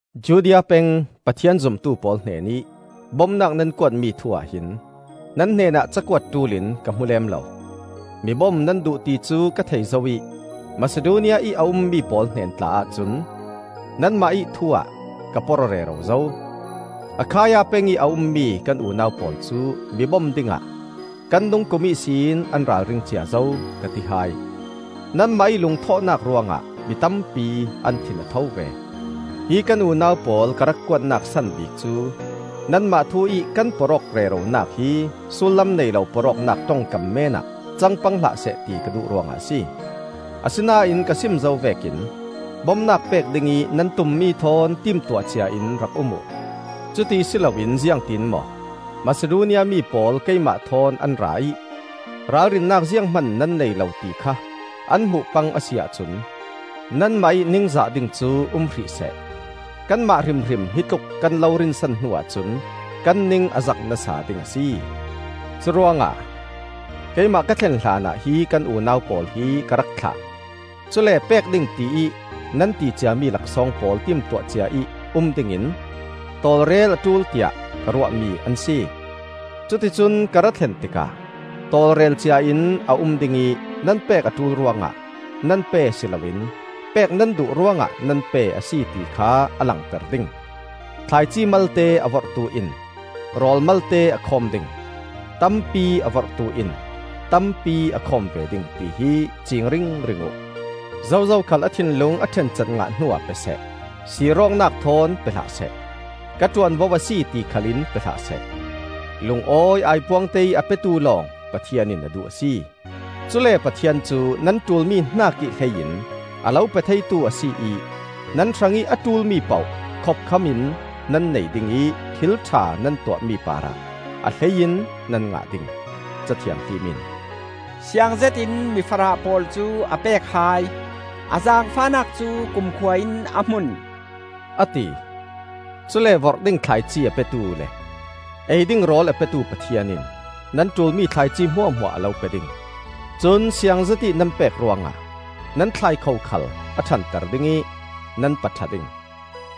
Judea peng Pathian zumtu pawl hnenih bomnak nan kuatmi thu-ah hin nan hnenah cakuat ṭul in ka hmu lem lo. Mi bom nan duh ti cu ka thei zo ih Masidonia ih a ummi pawl hnen tla ahcun nanmah ih thu-ah ka porh-aw rero zo. “Akhaia pengih a ummi kan unau pawl cu mi bom dingah kan dung kum ihsin an ralring cia zo,” ka ti hai. Nanmah ih lungthawhnak ruangah mi tampi an thin a tho ve. Hi kan unau pawl ka rak kuatnak san bik cu nanmah thu-ih kan porh-awk reronak hi sullam nei lo porhawknak ṭongkam meenah cang pang hlahseh ti ka duh ruangah a si. Asinain ka sim zo vekin bomnak pek dingih nan tummi thawn timtuah ciain rak um uh. Cuti si loin ziangtin maw, Masidonia mi pawl keimah thawn an ra ih ralrinnak zianghman nan nei lo ti kha an hmuh pang a si ahcun nanmah ih ningzah ding cu um hrihseh; kanmah hrimhrim hitluk kan lo rinsan hnuah cun kan ning a zak nasa ding a si. Curuangah keimah ka thlen hlanah hi kan unau pawl hi ka rak thlah; cule pek ding tiih nan ti ciami laksawng pawl timtuah ciaih um dingin tawlrel a ṭul tiah ka ruahmi an si. Cuticun ka ra thlen tikah tawlrel ciain a um dingih nan pek a ṭul ruangah nan pe si loin pek nan duh ruangah nan pe a si ti kha a langter ding. Thlaici malte a vorhtu in rawl malte a khawm ding; tampi a vorhtu in tampi a khawm ve ding, tihi ciing ringring uh. Zozo khal a thinlung a ṭhencat ngah hnuah pe seh; sir awknak thawn pe hlah seh; ka ṭuanvo a si, ti khalin pe hlah seh. Lungawi aipuangte ih a petu lawng Pathian in a duh a si. Cule Pathian cu nan ṭulmi hnakih hlei in a lo pe theitu a si ih nan hrangih a ṭulmi poh khopkhamin nan nei ding ih thil ṭha nan tuahmi parah a hlei in nan ngah ding. Ca Thianghlim in: “Siangzetin mi farah pawl cu a pek hai; A zaangfahnak cu kumkhua in a hmun,” a ti. Cule vorh ding thlaici a petu le ei ding rawl a petu Pathian in nan ṭulmi thlaici hmuahhmuah a lo pe ding; cun siang zetih nan pek ruangah nan thlaikho khal a ṭhanter ding ih nan paṭha ding.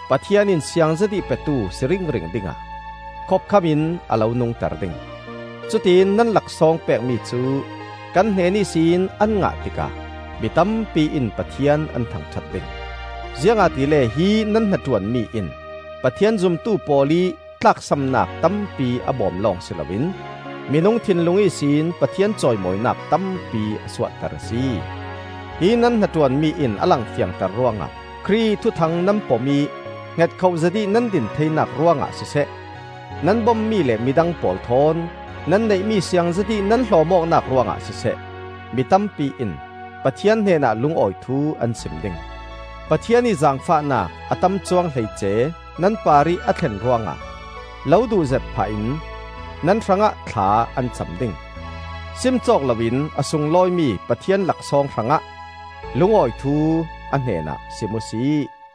Pathian in siang zetih petu si ringring dingah khopkhamin a lo nungter ding; cutiin nan laksawng pekmi cu kan hnen ihsin an ngah tikah mi tampi in Pathian an thangṭhat ding. Ziangahtile hi nan hnaṭuanmi in Pathian zumtu pawl ih tlaksamnak tampi a bom lawng si loin minung thinlung ihsin Pathian cawimawinak tampi a suahter a si. Hi nan hnaṭuanmi in a lang fiangter ruangah Khrih ih Thuthang nan pom ih hngetkhoh zetih nan din theinak ruangah siseh, nan bommi le midang pawl thawn nan neihmi siang zetih nan hlawm awknak ruangah siseh, mi tampi in Pathian hnenah lungawi thu an sim ding. Pathian ih zaangfahnak a tam cuang hleice nan parih a thlen ruangah lo duhzet phah in nan hrangah thla an cam ding. Sim cawk loin a sunglawimi Pathian laksawng hrangah lungawi thu a hnenah sim uhsi.